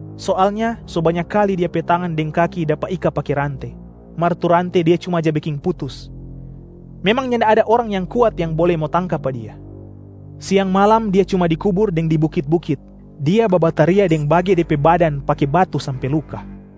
Soalnya so banya kali dia pe tangan deng kaki dapa ika pake rante, mar tu rante dia cuma ja beking putus. Memang nyanda ada orang yang kuat yang bole mo tangka pa dia. Siang malam dia cuma di kubur deng di bukit-bukit, dia babataria deng bage de pe badan pake batu sampe luka.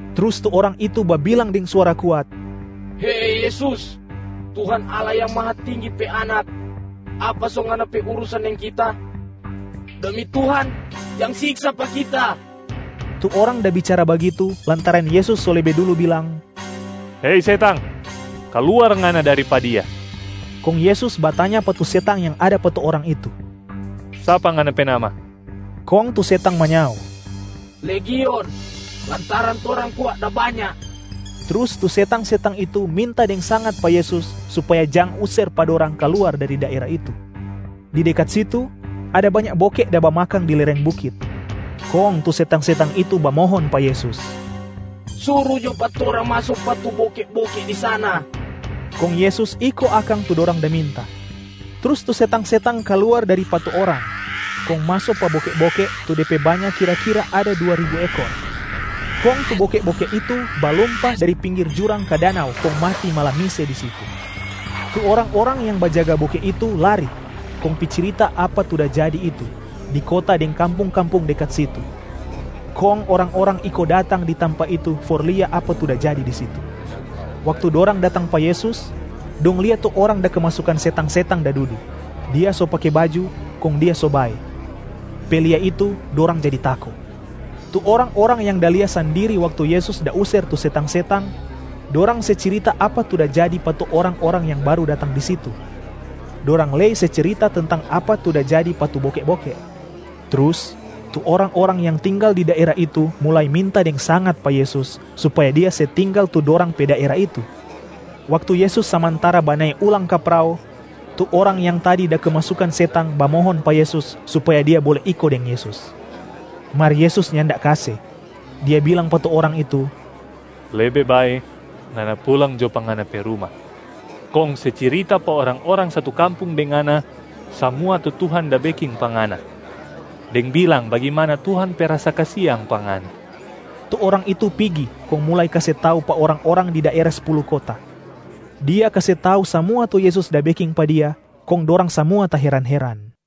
Trus tu orang itu babilang deng suara kuat, “Hei Yesus, Tuhan Allah Yang Mahatinggi pe Anak! Apa so Ngana pe urusan deng kita? Demi Tuhan, jang siksa pa kita!” Tu orang da bicara bagitu, lantaran Yesus so lebe dulu bilang, “Hei setang! Kaluar ngana dari pa dia.” Kong Yesus batanya pa tu setang yang ada pa tu orang itu, “Sapa ngana pe nama?” Kong tu setang manyao, “Legion, lantaran torang kwa da banya.” Trus tu setang-setang itu minta deng sangat pa Yesus supaya jang user pa dorang kaluar dari daera itu. Di dekat situ, ada banya boke da bamakang di lereng bukit. Kong tu setang-setang itu bamohon pa Yesus, “Suru jo pa torang maso pa tu boke-boke di sana.” Kong Yesus iko akang tu dorang da minta. Trus tu setang-setang kaluar dari pa tu orang, kong maso pa boke-boke tu de pe banya kira-kira ada dua ribu ekor. Kong tu boke-boke itu balumpa dari pinggir jurang ka danau kong mati malamise di situ. Tu orang-orang yang bajaga boke itu lari kong pi cirita apa tu da jadi itu di kota deng kampung-kampung dekat situ. Kong orang-orang iko datang di tampa itu for lia apa tu da jadi di situ. Waktu dorang datang pa Yesus, dong lia tu orang da kemasukan setang-setang da dudu, dia so pake baju kong dia so bae. Pe lia itu dorang jadi tako. Tu orang-orang yang da lia sandiri waktu Yesus da user tu setang-setang, dorang se cirita apa tu da jadi pa tu orang-orang yang baru datang di situ. Dorang lei se cirita tentang apa tu da jadi pa tu boke-boke. Trus tu orang-orang yang tinggal di daera itu mulai minta deng sangat pa Yesus supaya Dia se tinggal tu dorang pe daera itu. Waktu Yesus samantara banae ulang ka prao, tu orang yang tadi da kemasukan setang bamohon pa Yesus supaya dia bole iko deng Yesus. Mar Yesus nyanda kase, Dia bilang pa tu orang itu, “Lebe bae, ngana pulang jo pa ngana pe ruma, kong se cirita pa orang-orang satu kampung deng ngana samua tu Tuhan da beking pa ngana, deng bilang bagimana Tuhan pe rasa kasiang pa ngana.” Tu orang itu pigi kong mulai kase tau pa orang-orang di daera Spulu Kota. Dia kase tau samua tu Yesus da beking pa dia, kong dorang samua taheran-heran.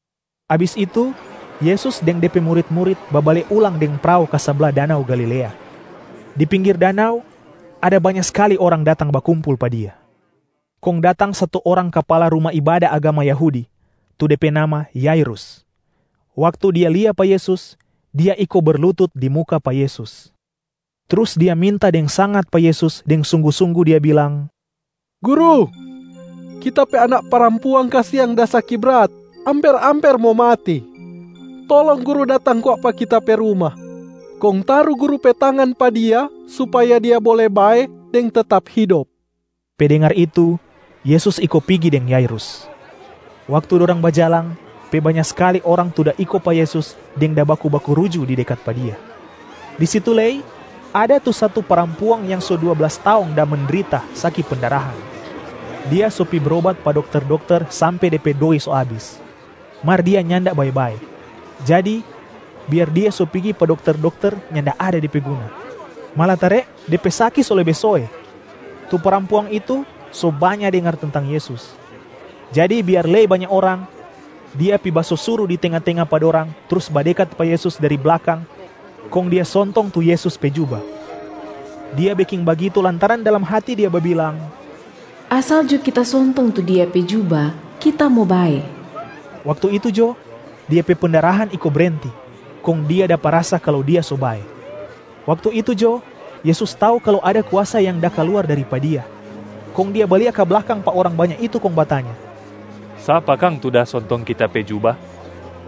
Abis itu Yesus deng De pe murit-murit babale ulang deng prao ka sabla danau Galilea. Di pinggir danau, ada banya skali orang datang bakumpul pa Dia. Kong datang satu orang kapala ruma ibada agama Yahudi, tu de pe nama Yairus. Waktu dia lia pa Yesus, dia iko berlutut di muka pa Yesus, trus dia minta deng sangat pa Yesus deng sunggu-sunggu, dia bilang, “Guru, kita pe anak parampuang kasiang da saki brat, amper-amper mo mati. Tolong Guru datang kwa pa kita pe ruma, kong taru Guru pe tangan pa dia supaya dia bole bae deng tetap hidop.” Pe dengar itu, Yesus iko pigi deng Yairus. Waktu dorang bajalang, pe banya skali orang tu da iko pa Yesus deng da baku-baku ruju di dekat pa Dia. Di situ lei ada tu satu parampuang yang so dua blas taong da mendrita saki pendarahan. Dia so pi brobat pa dokter-dokter sampe de pe doi so abis, mar dia nyanda bae-bae. Jadi biar dia so pigi pa dokter-dokter nyanda ada de pe guna, malatare de pe saki so lebe soe. Tu parampuang itu so banya dengar tentang Yesus. Jadi biar lei banya orang, dia pi basosuru di tenga-tenga pa dorang trus badekat pa Yesus dari blakang kong dia sontong tu Yesus pe juba. Dia beking bagitu lantaran dalam hati dia babilang, “Asal jo kita sontong tu Dia pe juba, kita mo bae!” Waktu itu jo dia pe pendarahan iko brenti kong dia dapa rasa kalu dia so bae. Waktu itu jo Yesus tau kalu ada kuasa yang da kaluar dari pa Dia, kong Dia balia ka blakang pa orang banya itu kong batanya, “Sapa kang tu da sontong Kita pe juba?”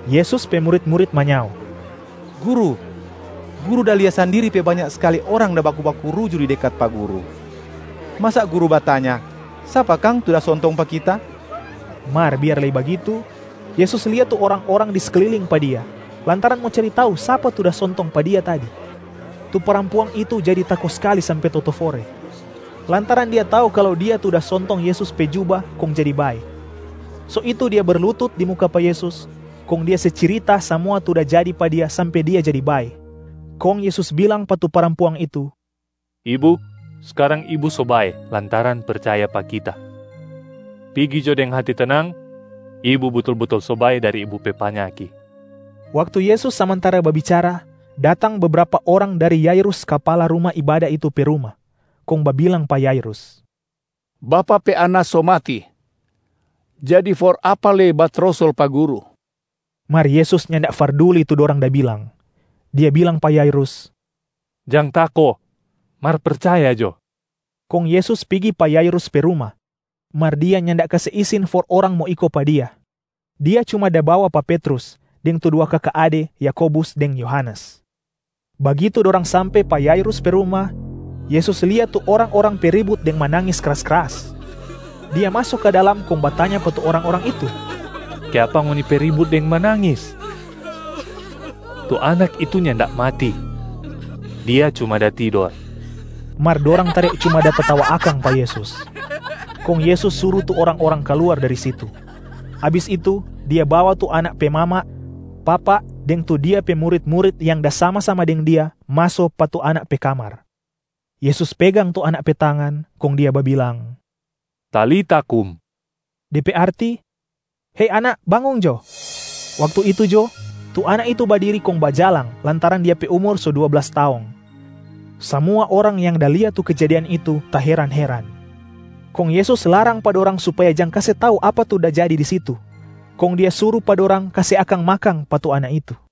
Yesus pe murit-murit manyao, “Guru, Guru da lia sandiri pe banya skali orang da baku-baku ruju di dekat pa Guru, masa Guru batanya, ‘Sapa kang tu da sontong pa Kita?’” Mar biar lei bagitu, Yesus lia tu orang-orang di sekliling pa Dia, lantaran mo cari tau sapa tu da sontong pa Dia tadi. Tu parampuang itu jadi tako skali sampe totofore, lantaran dia tau kalu dia tu da sontong Yesus pe juba kong jadi bae. So itu dia berlutut di muka pa Yesus, kong dia se cirita samua tu da jadi pa dia sampe dia jadi bae. Kong Yesus bilang pa tu parampuang itu, “Ibu, skarang ibu so bae lantaran percaya pa Kita. Pigi jo deng hati tenang, ibu butul-butul so bae dari ibu pe panyaki.” Waktu Yesus samantara babicara, datang bebrapa orang dari Yairus kapala ruma ibada itu pe ruma, kong babilang pa Yairus, “Bapak pe anak so mati, jadi for apa lei batrosol pa Guru?” Mar Yesus nyanda farduli tu dorang da bilang. Dia bilang pa Yairus, “Jang tako, mar percaya jo.” Kong Yesus pigi pa Yairus pe ruma, mar Dia nyanda kase isin for orang mo iko pa Dia, Dia cuma da bawa pa Petrus, deng tu dua kaka ade Yakobus deng Yohanes. Bagitu dorang sampe pa Yairus pe ruma, Yesus lia tu orang-orang pe ribut deng manangis kras-kras. Dia maso ka dalam kong batanya pa tu orang-orang itu, “Kiapa ngoni pe ribut deng manangis? Tu anak itu nyanda mati, dia cuma da tidor!” Mar dorang tare cuma da tatawa akang pa Yesus. Kong Yesus suru tu orang-orang kaluar dari situ. Abis itu Dia bawa tu anak pe mama, papa deng tu Dia pe murit-murit yang da sama-sama deng Dia maso pa tu anak pe kamar. Yesus pegang tu anak pe tangan kong Dia babilang, “Talita kum”a de pe arti ‘Hei anak, bangong jo!’ Waktu itu jo tu anak itu badiri kong bajalang lantaran dia pe umur so dua blas taong. Samua orang yang da lia tu kejadian itu taheran-heran. Kong Yesus larang pa dorang supaya jang kase tau apa tu da jadi di situ, kong Dia suru pa dorang kase akang makang pa tu anak itu.